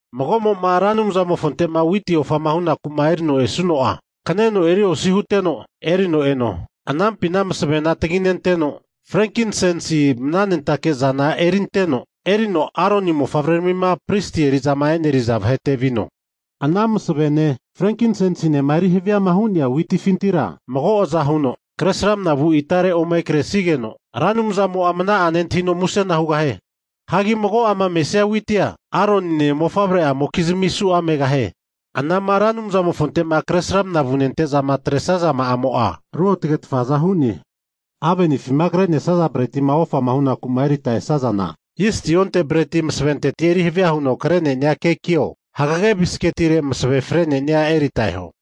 Mago'mo'ma Ra Anumzamofonte'ma witi ofa'ma hunaku'ma erino esuno'a kaneno eri osi huteno, erino eno. Anampina masavena taginenteno frenkinsensi nehaza mnanentake'zana erinteno, erino Aroni mofavreramima pristi eri'zama e'neriza vahete vino. Ana masavene frenkinsensinema eri haviama hu'nea witifintira mago aza huno, kresramana vu itare ome kresigeno Ra Anumzamo'a mana'a nentahino musena hugahie. Hagi mago'ama mesia witia Aronine mofavre'amokizmi su'a megahie. Anama Ra Anumzamofonte'ma kre sramana vunente'za atresazama'amo'a ruotagetfaza hu'ne. Avenifima kre'nesaza bretima ofama hunaku'ma erita esazana, zisti onte breti masaventeti eri havia huno kre'ne'nia kekio, hagege bisketire masave fre'ne'nia erita eho.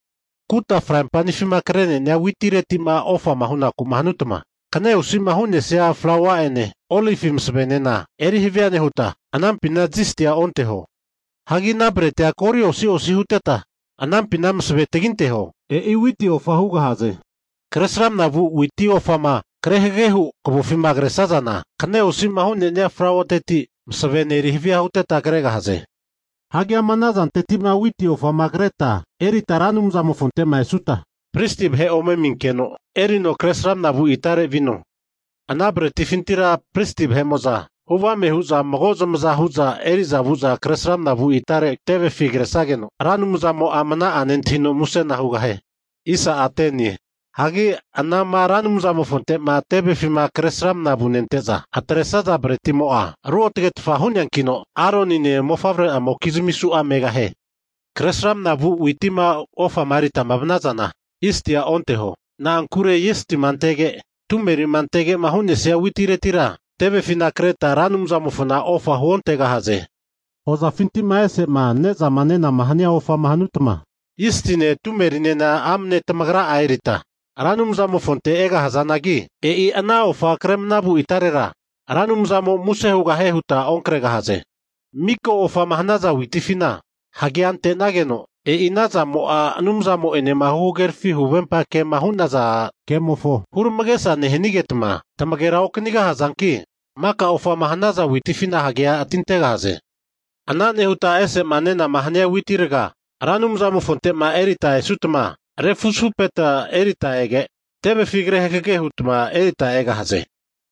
Kuta fraimpenifima kre'ne'nia witireti'ma ofama hunaku'ma hanutma, kaneosi'ma hu'nesia flaua'ene olivi masavenena erihavia nehuta, anampina zistia onteho. Hagi ana bretia goli osi osi huteta, anampina masave taginteho. E'i witi ofa hugahaze. Kresramana vu witi ofama kre hagage hu kavofima kresazana, kaneosi osi'ma hu'nesia flauateti masavene eri havia huteta kregahaze. Hagi ama ana zantetima witi ofama kreta erita Ra Anumzamofonte'ma esuta, pristi vahe ome aminkeno, erino kresramna vu itarera vino. Ana bretifintira pristi vahe'mo'za huvame hu'za mago zamaza hu'za eri'za kre manavu itare tevefi kresageno, Ra Anumzamo'a mana'a nentahino musena hugahie. Hagi anama Ra Anumzamofonte'ma tevefima kresramana vunente'za atresaza bretimo'a, ruotgetfa hu'neankino Aronine mofavre'amokizmi su'a megahie. Kresramana vu witima ofama erita vanazana, zistia onteho, na'ankure zistima antege tumerima antege'ma hu'nesia witiretira tevefina kreta Ra Anumzamofona ofa huontegahaze. Hozafinti'ma e'sema ne'zama nenama hania ofama hanutma, zistine tumerinena amne tamagra erita Ra Anumzamofonte egahazanagi, e'i ana ofa kremnavu itarera Ra Anumzamo muse hanie huta onkregahaze. Miko ofama hanaza witifina hagea antenageno, e'i ana zamo'a Anumzamo'enema huhagerafi huvempa ke'ma hu'naza kemofo huramagesa nehanigetma, tamagera okanigahazanki maka ofama hanaza witifina hagea atintegahaze. Ana nehuta ese'ma nena hania witi raga Ra Anumzamofonte'ma ofa huku'ma erita esutma, refuzafupeta eritma ege' tevefi kre hagage hutma erita egahaze.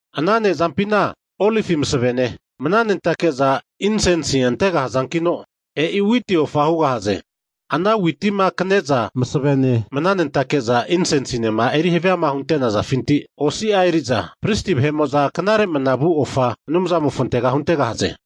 Ana ne'zampina olivi masavene, mnanentake'za insensi antegahazankino, e'i witi ofa hugahaze. Ana Witima kne'za masavene mnanentake'za insensinema eri haviama hunte'nazafinti osi'a eri'za, Pristi vahe'mo'za knare manavu ofa Anumzamofontega huntegahaze.